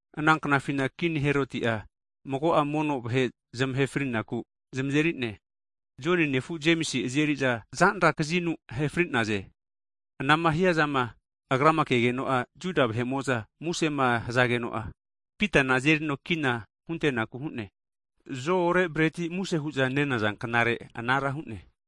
Ana knafina Kini Heroti'a mago'a mono vahe zamahe, frinaku zamazeri'ne. Joni nefu Jemisi azeri'za zanra kazinu ahe fri'naze. Anama hiazama Agrama kegeno Juda vahe'mo'za musema hazageno'a, Pitana azerino kina hunteku hu'ne. (Zo'ore breti muse hu'za nenaza knare, anara hu'ne.)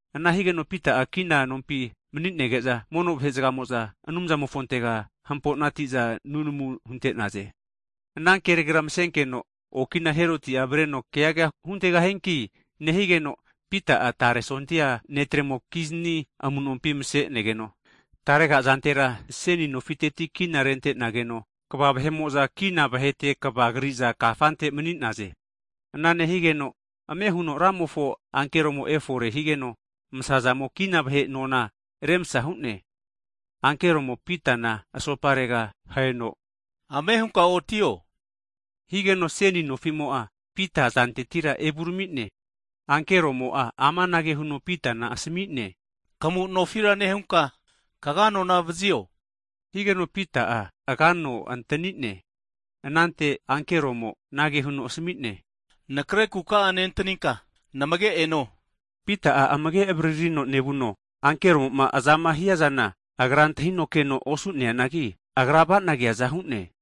Ana higeno Pita'a kina nompi mani'nege'za, mono vahe'zgamo'za Anumzamofontega hampo'nati'za nunamu hunte'naze. Ana kenegera masenkeno okina Heroti'a avareno keaga huntegahianki nehigeno, Pita'a tare sondia netremokizni amunompi masenegeno, tarega azantera seni nofiteti kina rentenageno, kva vahe'mo'za kina vahete kava kri'za kafante mani'naze. Ana nehigeno ame huno, Ramofo ankeromo efore higeno, masamo kina vahe nona remsa hu'ne. Ankeromo Pitana asoparega aheno ame hunka otio! Higeno seni nofimo'a Pita azantetira evurami'ne. Ankeromo'a amanage huno Pitana asami'ne, Kamu'nofira nehunka kaga nona vazio, higeno Pita'a agano antanine. Anante ankeromo anage huno asami'ne, anakre kuka'a nentaninka namage' eno hu'ne. Pita'a amage' avaririno nevuno, ankeromo'ma azama hiazana agra antahino keno osu'neanagi, agra avana keaza hu'ne.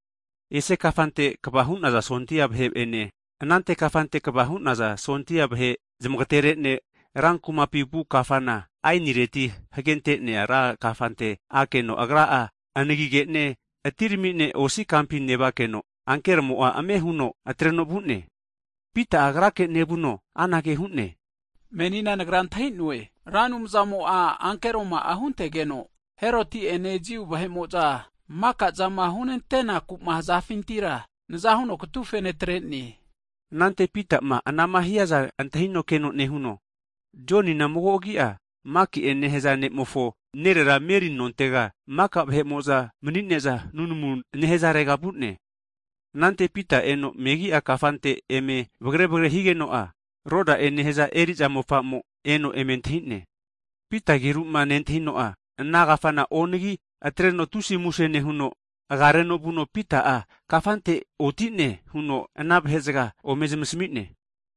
Ese kafante kava hu'naza sondia vahe'ene, anante kafante kava hu'naza sondia vahe zamagterete'ne, ran kumapi vu kafana aenireti hagente'nea ran kafante akeno agra'a kafamo'a anagige'ne atirami'ne osi kampi nevakeno, ankeromo'a ame huno atreno vu'ne, Pita'a agrake nevuno amanage hu'ne, menina nagra antahi'noe, Ra Anumzamo'a ankeroma'a huntegeno, Heroti'ene Jiu vahe'mo'za maka'zama hunantenaku hazafintira naza huno katufe natre'ne. Anante Pitama anama hiaza antahino keno nehuno, Jonina mago agi'a Maki'e nehaza ne'mofo nerera Meri nontega, maka vahe'mo'za mani'neza nunamu nehazarega vu'ne Anante Pita eno megi'a kafante eme vagare vagare higeno'a, Roda'e nehaza eri'za mofa'mo eno eme antahi'ne Pita ageruma nentahino'a, ana kafana onagi atreno tusi muse nehuno, agareno vuno Pita'a kafante oti'ne huno ana vahe zga ome zamasmi'ne.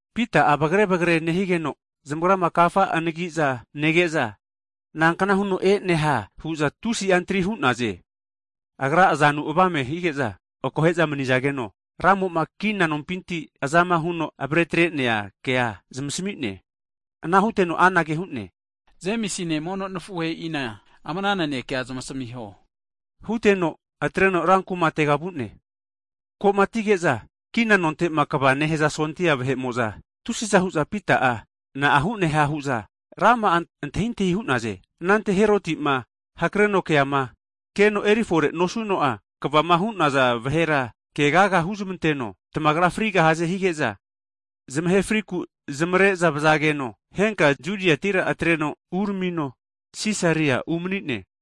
Pita vagare vagare nehigeno zamagrama kafa anagi'za nege'za, nankna huno e'neha hu'za tusi'a antri hu'naze. Agra azanu avame hige'za akohe'za mani'zageno Ramo'ma kina nompinti azama huno avare atre'nea kea zamasmi'ne. Ana huteno anage hu'ne, Jemisine mono nafuheina ama ana nanekea zamasmiho huteno atreno ru kumatega vu'ne. Ko'ma atige'za, kina nonte'ma kva hu'naza sondia vahe'mo'za tusiza hu'za Pita'a na'a hu'neha hu'za rama'a antahintahi hu'naze. Anante Heroti'ma hakareno keama, keno erifore nosuno'a kavama hu'naza vahera kegaga huzmanteno tamagra frigahaze hige'za, zamahe friku zamare'za vazageno, henka Judiatira atreno uramino Sisaria umani'ne.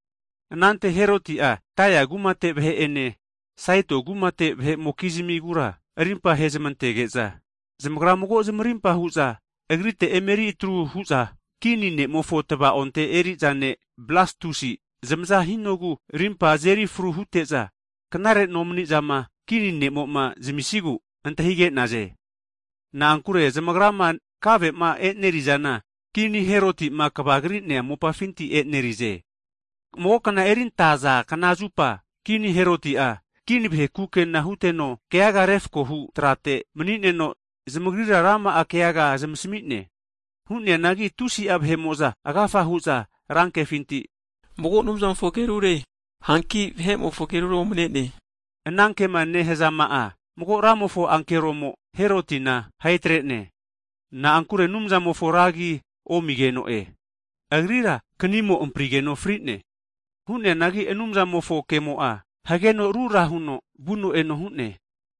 Anante Heroti'a Taia kumate vahe'ene, Saito kumate vahe'mokizmigura arimpa ahezamantege'za, zamagra mago zamarimpa hu'za agrite emeri atru hu'za, Kini ne'mofo tva'onte eri'za ne' Blastusi, zamaza hinogu rimpa azeri fru hute'za, knare nomanizama kini ne'mo'ma zamisigu antahige'naze. Na'ankure zamagrama kave'ma e'nerizana kini Heroti'ma kava kri'nea mopafinti e'neri'ze. Mago kna erintaza knazupa, Kini Heroti'a kini vahe kukena huteno, keaga refakohu trate mani'neno zamagrira rama'a keaga zamasmi'ne. Hu'neanagi tusi'a vahe'mo'za agafa hu'za rankehu'za mago anumzamofo agerure, hanki vahe'mofo agerura omane'ne! hu'naze. Ana kema nehazama'a, mago Ramofo ankeromo Herotina ahe tre'ne, na'ankure Anumzamofo ra agi omigeno agrira knimo amprigeno fri'ne. Hu'neanagi Anumzamofo kemo'a hageno rura huno vuno eno hu'ne.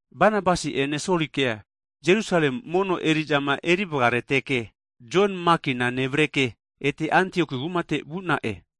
Banabasi'ene Solikea Jerusale mono eri'zama eri vgareteke, Jon Makina nevareke ete Antioku kumate vu'na'e.